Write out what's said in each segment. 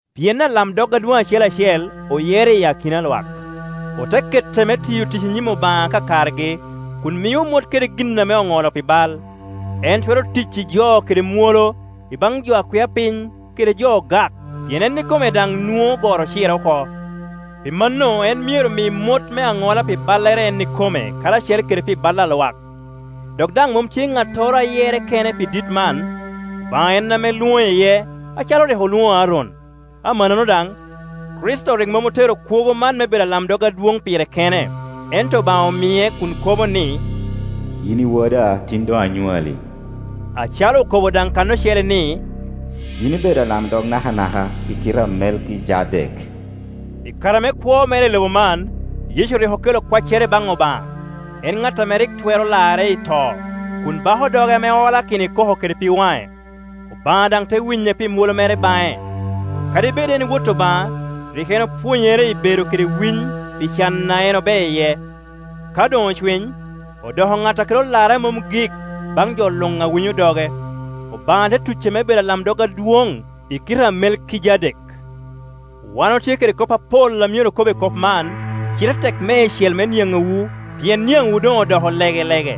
Pien alamdog adwoŋ acel acel oyero i akina a lwak, ote kete me tiyo tic i nyim Obaŋa akakargi, kun mio mot kede gin ame oŋolo pi bal. En twero tic i jo kede mwolo i baŋ jo a kwia piny kede jo ogak, pien en ikome daŋ nwoŋo goro ocire oko. Pi mano en myero mi mot me aŋola pi ballere en ikome, karacel kede pi bal a lwak. Dok daŋ mom tye ŋattoro a yerre kene pi dit man, Obaŋa en ame lwoŋe iye, acalo rik olwoŋo Aron. Amannono daŋ, Kricito rik mom otero kwogo man me bedo alamdog adwoŋ pire kene, ento Obaŋa omie, kun kobo ni, “Yin i Woda, tin doŋ anywali”; acalo okobo daŋ kan ocele ni, “Yin ibedo alamdog nakanaka, i kite a Melkijadek.” I kare me kwo mere i lobo man, Yecu rik okelo kwaccere baŋ Obaŋa, en ŋat ame rik twero lare i to, kun bako doge ame olakino i koko kede pig waŋe, Obaŋa daŋ te winye pi mwolo mere baŋe. Kadi bed en Wot Obaŋa, rik en opwonyere i bedo kede winy pi can a en obeo iye. Ka doŋ ocwiny, odoko ŋat a kelo larre a mom gik baŋ jo luŋ a winyo doge. Obaŋa te tuce me bedo alamdog adwoŋ i kite a Melkijadek. Wan otye kede kop apol a myero okob i kop man, cite tek meicel me niaŋowu, pien niaŋwu doŋ odoko legelege.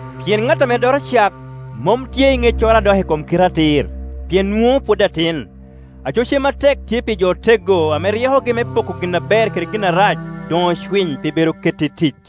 Pien ŋat ame doto cak mom tye i ŋeccoro a dok i kom kite atir, pien nwoŋo pwod atin. Aco cem atek tye pi jo oteggo, ame ryekogi me poko gin aber kede gin arac doŋ ocwiny pi be do keto i tic.